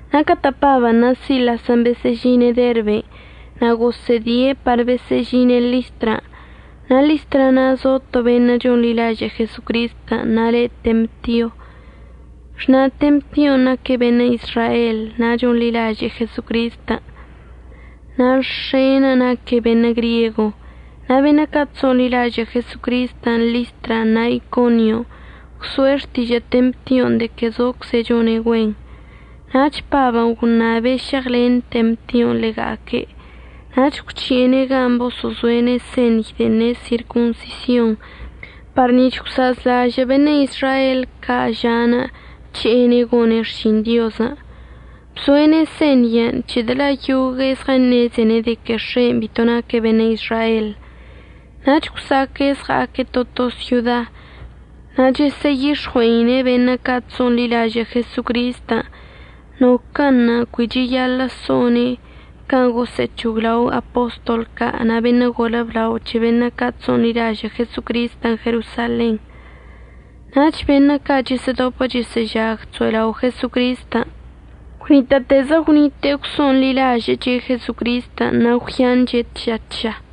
Na' catə' Pabən' na' Silasən' besə'əžine' Derben' na' gosə'ədie' par besə'əžine' Listran'. Na' Listra na' zo to beṉə' chonḻilažə' Jesocristən' na' le' Temtio. Xna' Temtion' naque' beṉə' Izrael na' chonḻilaže'e Jesocristən', na' x̱e'enə' naque' beṉə' griego. Na' beṉə' ca' chso'onḻilažə' Jesocristən' Listran' na' Iconion' gwso'e xtižə' Temtion' de que zocze' chone' güen. Nach Pabən' gwṉabe' šeɉlen Temtion' ḻega'aque', nach gwc̱hi'ene' gan' boso'ozo'ene' señy de'en ne' sirconsision par nic̱h gwsa'azlažə' beṉə' Izrael ca' ža'anə' əc̱he'ene' gone' xšin Diozən'. Bzo'ene' señyən' c̱hedə' la' yogue'e zɉəṉezene' de que x̱e'enə' bito naque' beṉə' Izrael. Nach gwsa'aque' zɉa'aque' to to syoda na' chəsə'əyix̱ɉue'ine' beṉə' ca' chso'onḻilažə' Jesocristən' noquə'ənṉə' cui cheyaḻə' so'one' can' gosə'əc̱hoglao apostol ca' na' beṉə' golə blao c̱he beṉə' ca' chso'onḻilažə' Jesocristən' Jerosalenṉə'. Nach beṉə' ca' chəsə'ədopə chəsə'əžag chso'elaogüe'e Jesocristən' gwnitə'ətezə gwnite'e gwso'onḻilažə'əche' Jesocristən' na' gwyanche' tža tža.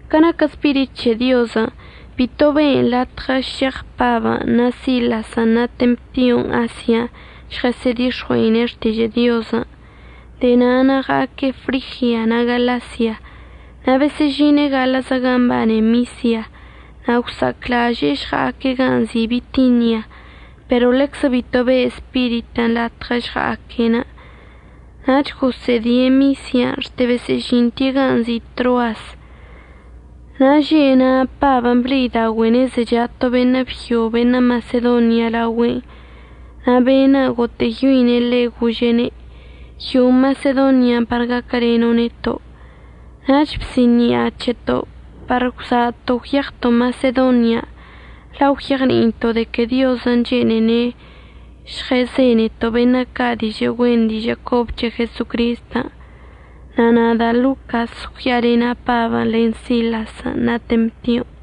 Ca naquə Spirit c̱he Diozən' bito be'en latɉə šeɉ Pabən' na' Silasən' na' Temtion' Asian' žɉəsə'ədix̱ɉui'e xtižə' Diozən', de'e na'anə' ɉa'aque' Frigia na' Galasia. Na' besə'əžine' gaḻə'əzə gan' mbane Misia. Na' gwsa'aclaže'e əžɉa'aque' gan' nzi' Bitinia, pero ḻeczə bito be'e Spiritən' latɉə əžɉa'aque'enə'. Nach gosə'ədie' Misian' xte besə'əžinte' gan' nzi' Troas. Na' že' na' Pabən' ble'idaogüe'ene' zecha to beṉə' byo beṉə' Masedonia laogüe'enə' na' be'enə' gotə'əyoine' ḻe' gože'ene': “Yo'o Masedonian' par gaquəleno' neto'.” Nach bsi'ini'a c̱heto' par gwza'ato' gwyeɉto' Masedonian' la' gwyeɉni'ito' de que Diozən' chene'ene' žɉezeneto' beṉə' ca' dižə' güen dižə' cobə c̱he Jesocristən', na' nada' Locas gwya'alena' Pabən' len Silasən' na' Temtion'.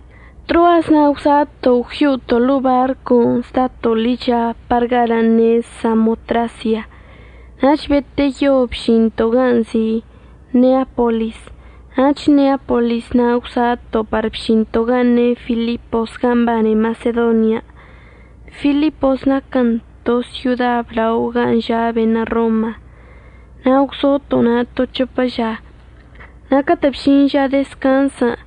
Troas na' gwza'ato' gwyo'oto' ḻo'o barcon' zdato' ḻicha par galən' ne' Samotrasia, nach beteyo bžinto' gan' nzi' Neapolis. Nach Neapolis na' gwza'ato' par bžinto' gan' ne' Filipos gan' mbane Masedonian'. Filiposən' naquən to syoda blao gan' ža' beṉə' Roma. Na' gwzoto' na' to c̱hopə ža. Na' catə' bžin ža dezcanzən'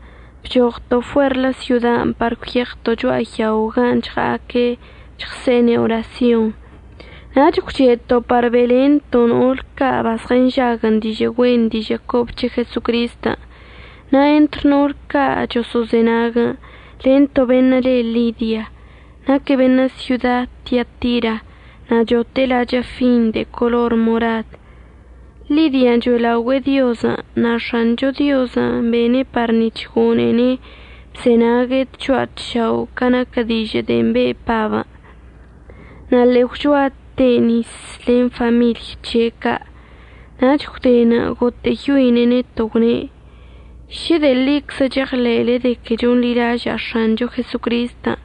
bchoɉto' fuerlə syodan' par gwyeɉto' cho'a yaon' gan' chɉa'aque' chɉse'ene' orasyonṉə', nach gwche'eto' par be'elento' no'ol ca' bazɉənžaguən' dižə' güen dižə' cobə c̱he Jesocristən'. Na' entr no'ol ca' choso'ozenaguən' len to beṉə' le Lidia. Naque' beṉə' syoda Tiatira na' chote'e lachə' fin de color morad. Lidian' cho'elaogüe'e Diozən' na' X̱ancho Diozən' bene' par nic̱h gone'ene' bzenague' tcho'a tšao' ca naquə dižə' de'en be' Pabən'. Na' ḻe'e gwchoate' nis len famiḻy c̱he' ca'. Nach gwdenə' gotə'əyoine' neto' gwne': ―Šə de'e ḻiczə cheɉḻe'ele de que chonḻilaža'a X̱ancho Jesocristən',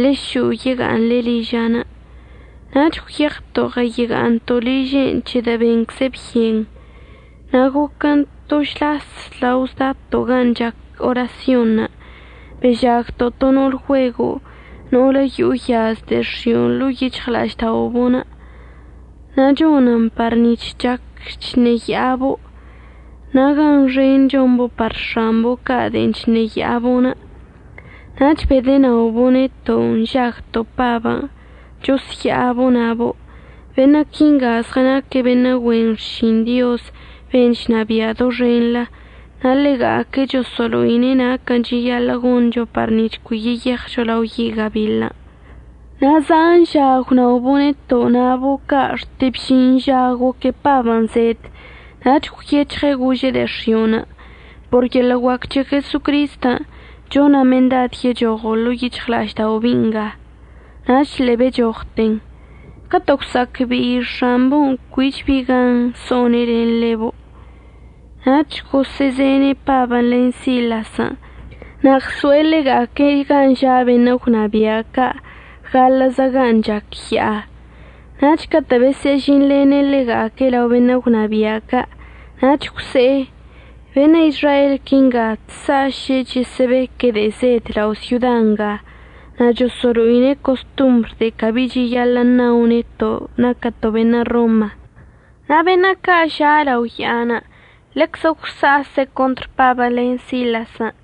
ḻe'e šo'o yega'aṉle liža'anə'. Nach gwyeɉto' ɉəyega'aṉto' liže'enə' c̱hedə' bencze' byen. Na' goquən to žlas lao zdato' gan' chac orasyonṉə' bežagto' to no'ol güego' no'olə yo'o yaz de'e x̱io' ḻo'o yic̱hɉla'ažda'obo'onə' na' chonən par nic̱h chac chṉeya'abo', na' gan xen chombo' par x̱ambo' ca' de'en chṉeya'abo'. Nach bedənaobo' neto' nžagto' Pabən' chosya'abo' nabo': ―Beṉə' quinga zɉənaque' beṉə' güen xšin Diozən' ben' chnabia' doxenḻə. Na' ḻega'aque' choso'olo'ine' naquən' cheyaḻə' goncho par nic̱h cui yeyeɉcho lao yi' gabiḻən'. Zan ža gwnaobo' neto' nabo' ca' xte bžin ža goque Pabən' zed nach gwyec̱hɉe' gože' de'e x̱io'onə': ―Por yeḻə' guac c̱he Jesocristən' chona' mendad yechoɉo' ḻo'o yic̱hɉla'aždao' bi'i nga. Nach ḻe'e bechoɉten. Catə' gwsa'acbe'i x̱ambo'onə' cuich bi gan so'one' len ḻebo' nach gosə'əzene' Pabən' len Silasən' na' ɉso'e ḻega'aque' gan' ža' beṉə' gwnabia' ca' gaḻə'əzə gan' chac ya'a. Nach catə' besə'əžinḻene' ḻega'aque' lao beṉə' gwnabia' ca' nach gwse'e: ―Beṉə' Izrael quinga chsa'aše' chəsə'əbeque' de'e zed lao' syoda nga. Na' choso'olo'ine' costombr de'e cabi cheyaḻə' ṉao neto' naquəto' beṉə' Roma. Na' beṉə' ca' ža' lao ya'anə' ḻeczə gwsa'ase' contr Pabən' len Silasən',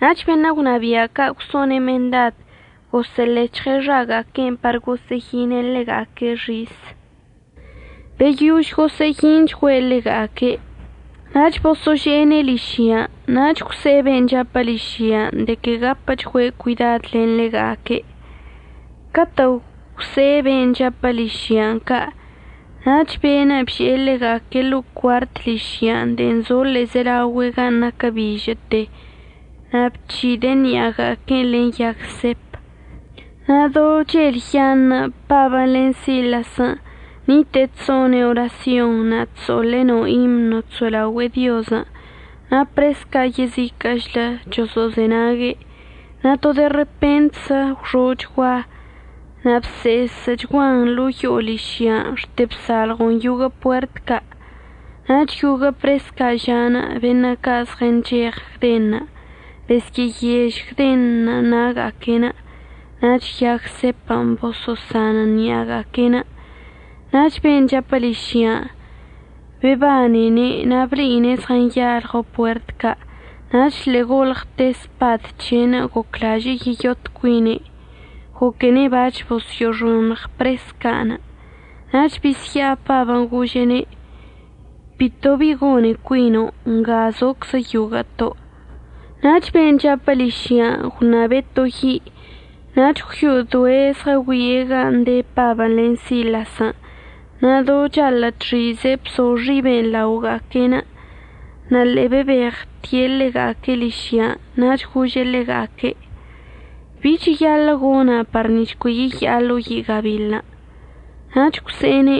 nach beṉə' gwnabia' ca' gwso'one' mendad gosə'əlec̱hɉe' xaga'aque'enə' par gosə'əyine' ḻega'aque' xis. Beyož gosə'əyinchgüe' ḻega'aque', nach boso'ože'ene' ližyan' nach gwse'e ben' chapə ližyan' de que gapəchgüe' cuidad len ḻega'aque'. Catə' gwse'e ben' chapə ližyan' ca' nach be'enə' bže'e ḻega'aque' ḻo'o cuart ližyan' de'en zo ḻe'ezelaogüe' gan' naquə bižə'əte na' bc̱hide'e ṉi'aga'aque'enə' len yag sep. Na' do chelyaṉə' Pabən' len Silasən' nite'e chso'one' orasyon na' chso'oḻe' no imno chso'elaogüe'e Diozən' na' pres ca' yeziquə'əchlə choso'ozenague'. Na' to de repentzə gwxo'ochgua, na' bse'esə'əchguan lan yo'o ližyan' xte bsalɉon yoguə' puert ca'. Nach yoguə' pres ca' ža'anə' beṉə' ca' zɉəncheɉ gdenṉə' besyə'əyež gdenṉə' na'aga'aque'enə' nach yag sepən' bosanən ṉi'aga'aque'enə'. Nach ben' chapə ližyan' bebanene' na' ble'ine' zɉənyalɉo puert ca' nach ḻe'e golɉte' spad c̱he'enə' goclaže'e yeyot cuine', goquene' bac̱h besyə'əxoṉɉ pres ca'anə'. Nach bisya'a Pabən' gože'ene': ―Bito bi gone cuino'. Nga zoczə yoguə'əto'. Nach ben' chapə ližyan' gwṉabe' to yi' nach gwyo'odoe' zɉəgüie' gan' de Pabən' len Silasən' na' do chaḻə' chxize' bzo xiben' laoga'aque'enə'. Na' ḻe'e bebeɉte' ḻega'aque' ližyan' nach gože' ḻega'aque': ―¿Bi cheyaḻə' gona' par nic̱h cui yeya'a lao yi' gabiḻən'? Nach gwse'ene':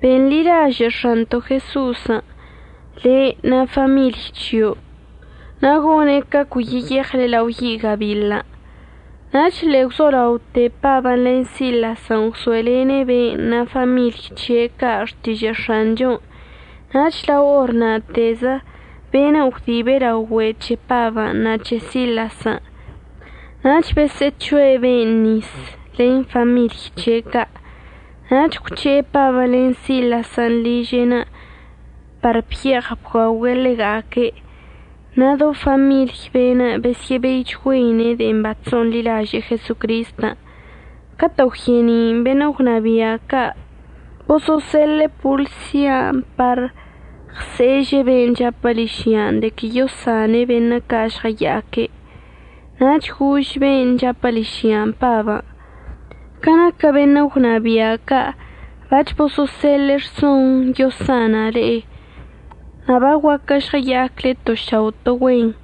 ―Benḻilažə' X̱anto' Jeso'osən' le' na' famiḻy c̱hio' na' gone' ca cui yeyeɉle lao yi' gabiḻən'. Nach ḻe'e gwzolaote Pabən' len Silasən' gwso'elene' be'enə' na' famiḻy c̱he' ca' xtižə' X̱anchon'. Nach lao or na'atezə be'enə' gwdibe' lao güe' c̱he Pabən' na' c̱he Silasən'. Nach bosə'əc̱ho'e be'enə' nis len famiḻy c̱he' ca'. Nach gwc̱he'e Pabən' len Silasən' liže'enə' par bye'eɉ bguaogüe' ḻega'aque'. Na' do famiḻy be'enə' besyə'əbeichgüeine' de'en bachso'onḻilaže'e Jesocristən'. Catə' gwye'eni'inə' beṉə' gwnabia' ca' boso'oseḻe'e polsia par ɉse'eže' ben' chapə ližyan' de que yosane' beṉə' ca' žɉəya'aque'. Nach gož be'enə' chapə ližyan' Pabən': ―Ca naquə beṉə' gwnabia' ca' bac̱h boso'oseḻe'e rson yosana' le'e. Na' baguaquə žɉəya'acle to šao' to güen.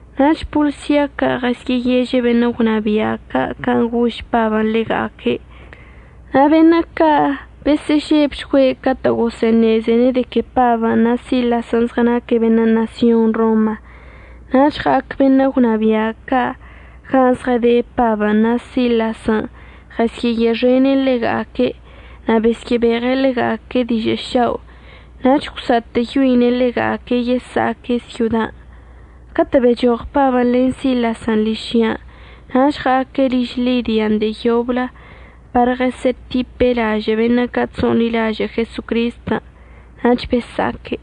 Nach polsia ca' ɉesyə'əyeže' beṉə' gwnabia' ca' can' gož Pabən' ḻega'aque'. Na' beṉə' ca' besə'əžebchgüe' catə' gosə'əṉezene' de que Pabən' na' Silasən' zɉənaque' beṉə' ṉasyon Roma. Nach ɉa'ac beṉə' gwnabia' ca' gan' zɉəde Pabən' na' Silasən' ɉəsyə'əye'exene' ḻega'aque' na' besyə'əbeɉe' ḻega'aque' dižə' šao' nach gwsa'atə'əyoine' ḻega'aque' yesa'aque' syodan'. Catə' bechoɉ Pabən' len Silasən' ližyan' nach ɉa'aque' liž Lidian' de'e yoblə par ɉesye'etipe' lažə' beṉə' ca' chso'onḻilažə' Jesocristən', nach besa'aque'.